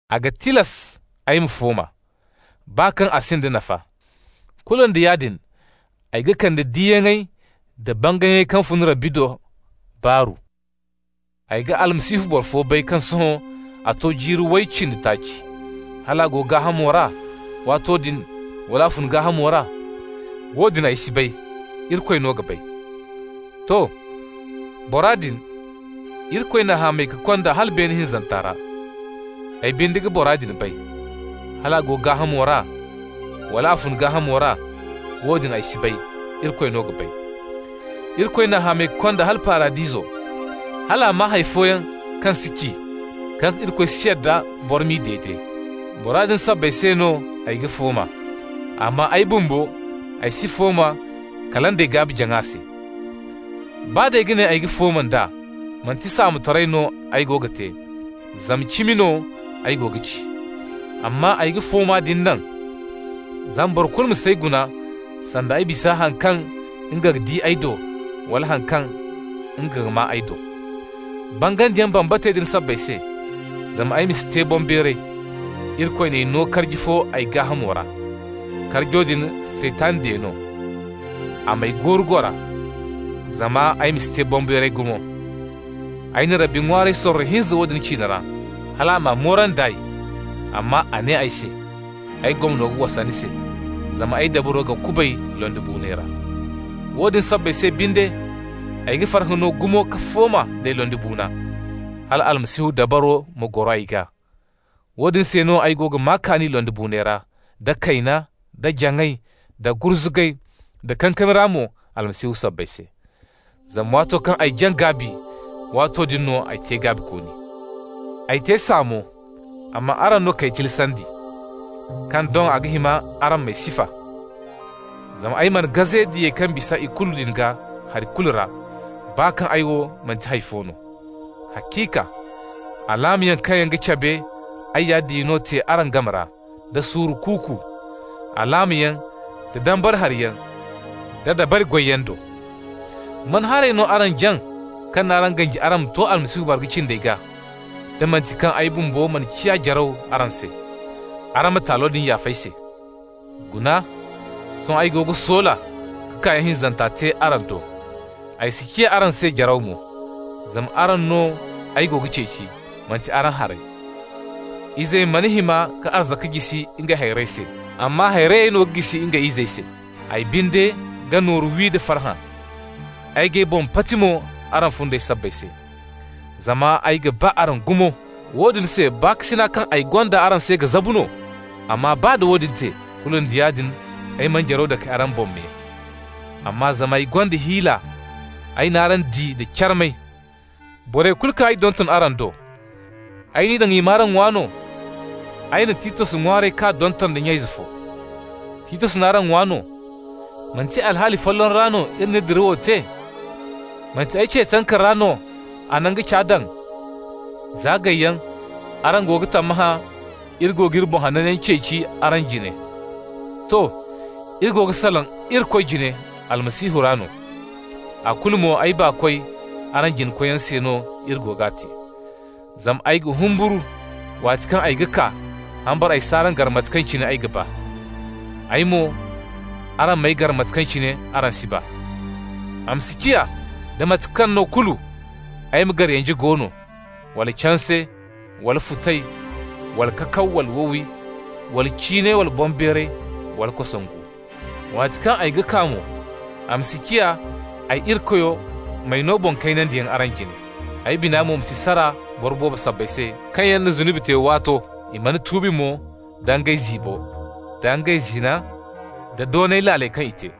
A ga tilas ay ma fooma, baa kaŋ a sinda nafa. Kulu nda yaadin ay ga kande diyaŋey da bangayyaŋey kaŋ fun Rabbi do baaru. Ay ga Almasihu boro fo bay kaŋ sohõ a to jiiri way cindi taaci. (Hal a go gaahamo ra waato din, wala a fun gaahamo ra, woodin ay si bay, Irikoy no ga bay.) To, bora din Irikoy n'a hamay ka konda hala beene hinzanta ra. Ay binde ga bora din bay (hal a go gaahamo ra, wala a fun gaahamo ra, woodin ay si bay, Irikoy no ga bay). Irikoy n'a hamay ka konda hala Paradiso, hal a maa hay fooyaŋ kaŋ si ci, kaŋ Irikoy si yadda boro m'i dede. Bora din sabbay se no ay ga fooma, amma ay bumbo se ay si fooma, kala day ay gaabi-jaŋa se. Baa d'ay ga ne ay ga fooma nd'a, manti saamotaray no ay go ga te, zama cimi no ay go ga ci. Amma ay ga fooma din naŋ, zama boro kulu ma s'ay guna sanda ay bisa haŋ kaŋ nga ga di ay do, wala haŋ kaŋ nga ga maa ay do. Bangandi bambatey din sabbay se, zama ay ma si te boŋbeeray, Irikoy n'ay no karji fo ay gaahamo ra. Karjo din Saytan diya no, a m'ay gooru-goora, zama ay ma si te boŋbeeray gumo. Ay na Rabbi ŋwaaray sorro hinza woodin ciine ra, hal a m'a moorandi nd'ay. Amma a ne ay se: «Ay gomno ga wasa ni se, zama ay dabaro ga kubay londibuunay ra.» Woodin sabbay se binde, ay ga farhã no gumo ka fooma nd'ay londibuuna, hal Almasihu dabaro ma goro ay gaa. Woodin se no ay go ga maa kaani londibuunay ra, da kayna, da jaŋay, da gurzugay, da kankami ra mo Almasihu sabbay se. Zama waato kaŋ ay jaŋ gaabi, waato din no ay te gaabikooni. Ay te saamo, amma araŋ no k'ay tilasandi, kaŋ doŋ a ga hima araŋ m'ay sifa. Zama ay mana gaze «diyey kaŋ ga bisa ikulu» din gaa hari kulu ra, baa kaŋ ay wo manti hay fo no. Haciika, alaamayaŋ kaŋ yaŋ cabe ay ya diya no te araŋ game ra da suuru kuuku, alaamayaŋ da dambara hariyaŋ da dabari goyyaŋ do. Man haray no araŋ jaŋ kaŋ n'araŋ ganji araŋ ma to Almasihu marga cindey gaa, da manti kaŋ ay bumbo mana ciya jaraw araŋ se? Araŋ ma taalo din yaaf'ay se! Guna, sohõ ay go ga soola ka kaayaŋ hinzanta te araŋ do. Ay si ciya araŋ se jaraw mo, zama araŋ no ay go ga ceeci, manti araŋ harey. Izey mana hima ka arzaka jisi ngey hayrey se, amma hayrey no ga jisi ngey izey se. Ay binde ga nooru wi da farhã, ay g'ay boŋ pati mo araŋ fundey sabbay se. Zama ay ga ba araŋ gumo, woodin se baakasina kaŋ araŋ gonda ay se ga zabu no? Amma baa da woodin te, kulu nda yaadin ay mana jaraw dake araŋ boŋ me! Amma zama ay gonda hiila, ay n'araŋ di da carmay. Borey kulu kaŋ ay donton araŋ do, ay n'i daŋ i m'araŋ ŋwa no? Ay na Titos ŋwaaray k'a donton da nya-ize fo. Titos n'araŋ ŋwa no? Manti alhaali folloŋ ra no iri n'iri dirawo te? Manti ay ce tanka ra no a na nga ca daŋ? Za gayyaŋ araŋ go ga tammahã iri go g'iri boŋ hananyaŋ ceeci araŋ jine. To, iri go ga salaŋ Irikoy jine Almasihu ra no. A kulu mo, ay baakoy, araŋ jina-koyyaŋo se no iri go g'a te. Zama ay ga humburu, waati kaŋ ay ga kaa, hambara ay s'araŋ gar mate kaŋ cine ay ga ba. Ay mo araŋ m'ay gar mate kaŋ cine araŋ si ba. A ma si ciya da mate kaŋ no kulu ay ma gar yanje go no, wala canse, wala futay, wala kakaw, wala wowi, wala ciinay, wala boŋbeeray, wala kosongu. Waati kaŋ ay ga kaa mo, a ma si ciya ay Irikoyo m'ay no boŋ-kaynandiyaŋ araŋ jine. Ay bina mo ma si sara boro boobo sabbay se kaŋ yaŋ na zunubi te waato, i mana tuubi mo da ngey ziibo, da ngey zina, da doonay laaley kaŋ i te.